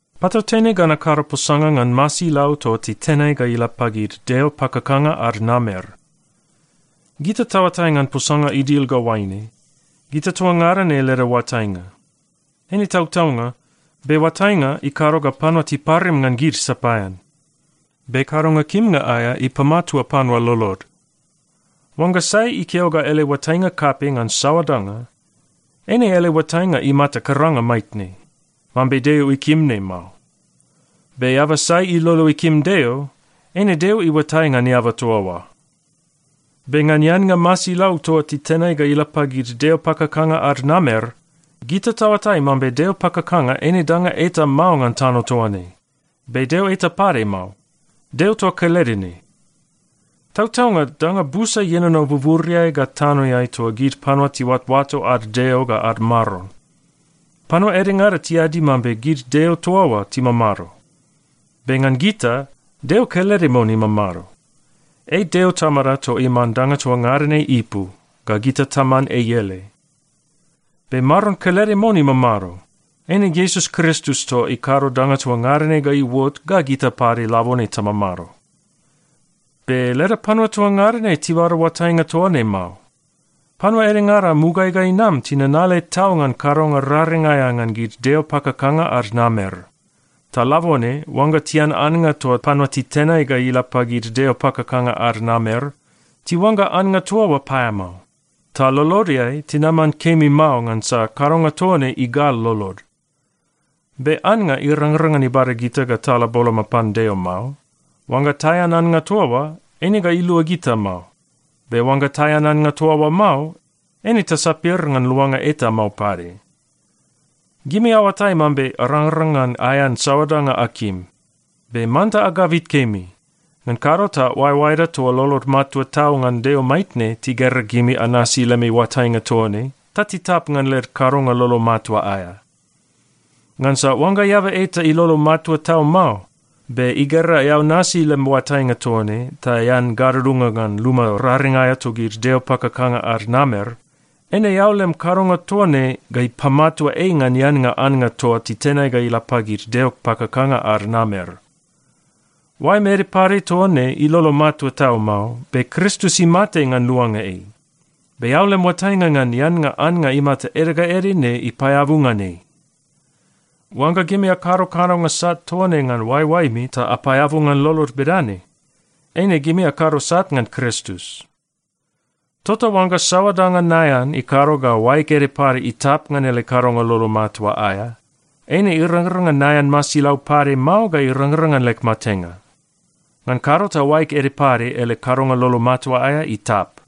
Patautene ga nakado posanga ngan masilau toa titenai ga ila pagid deo pakakanga ad namer. Gita taoatai ngan posanga idil ga oaine, “Gita toa ngada ne leda oatainga.” Eine tautaunga, be oatainga ikado ga panua tiparim ngan gid sapaean. Be kadonga kimnga aea ipamatua panua lolod. Oangga sai ikeo ga ele oatainga kapei ngan saoa danga, eine ele oatainga imata karanga maitne, mambe Deo ikim ne mao. Be eaba sai ilolo ikim Deo, eine Deo iuatai ngan eaba toa oa. Be ngan eannga masilau toa titenai ga ila pagid deo pakakanga ad namer, gita taoatai mambe deo pakakanga eine danga eta mao ngan tano toa ne. Be deo eta pade mao. Deo toa kelede ne. Tautaunga danga busa ienono buburiai ga tanoeai toa gid panua tiuatoato ad deo ga ad maron. Panua edengada tiadi mambe gid deo toa oa timamado, be ngan gita, Deo kelede mon imamado. Ei Deo Tamada toa iman danga toa ngada ne ipu, ga gita taman ei ele. Be Maron kelede mon imamado, eine Iesus Kristus toa ikado danga toa ngada ne ga iuot ga gita pade labone tamamado. Be leda panua toa ngada ne tibada oatainga toa ne mao. Panua edengada mugaeai ga inam tinanale tau ngan kadonga raring aea ngan gid deo pakakanga ad namer. Ta labone oangga tian annga toa panua titenai ga ila pagid deo pakakanga ad namer, tiuangga annga toa oa paeamao. Ta lolodeai, tinaman kemi mao ngansa kadonga toa ne igal lolod. Be annga irangrang ngan ibada gita ga tala boloma pan Deo mao. Oangga taean annga toa oa, eine ga ilua gita mao. Be oangga taean annga toa oa mao, eine tasapir ngan luanga eta mao pade. Gimi aoatai mambe arangrang ngan aean saoa danga akim. Be manta agabit kemi, ngan kado ta oaeoaeda toa lolod matua tau ngan Deo maitne tigera gimi anasi lemi oatainga toa ne ta titap ngan led kadonga lolo matua aea. Ngansa oangga eaba eta ilolo matua tau mao, be igera eao nasi lem oatainga toa ne ta ean gadudunga ngan luma raring aea togid deo pakakanga ad namer, eine eao lem kadonga toa ne ga ipamatua ei ngan eannga annga toa titenai ga ila pagid deo pakakanga ad namer. Oaem ede pade toa ne ilolo matua tau mao, be Kristus imate ngan luanga ei. Be eao lem oatainga ngan eannga annga imata ede ga ede ne ipaeabu ngan ei! Oangga gimi akado kadonga sat toa ne ngan oaeoaemi ta apaeabu ngan lolod bedane, eine gimi akado sat ngan Kristus. Tota oangga saoa danga naean ikado ga oaeg ede pade itap ngan ele kadonga lolo matua aea, eine irangrang ngan naean masilau pade mao ga irangrang ngan leg matenga. Ngan kado ta oaeg ede pade ele kadonga lolo matua aea itap.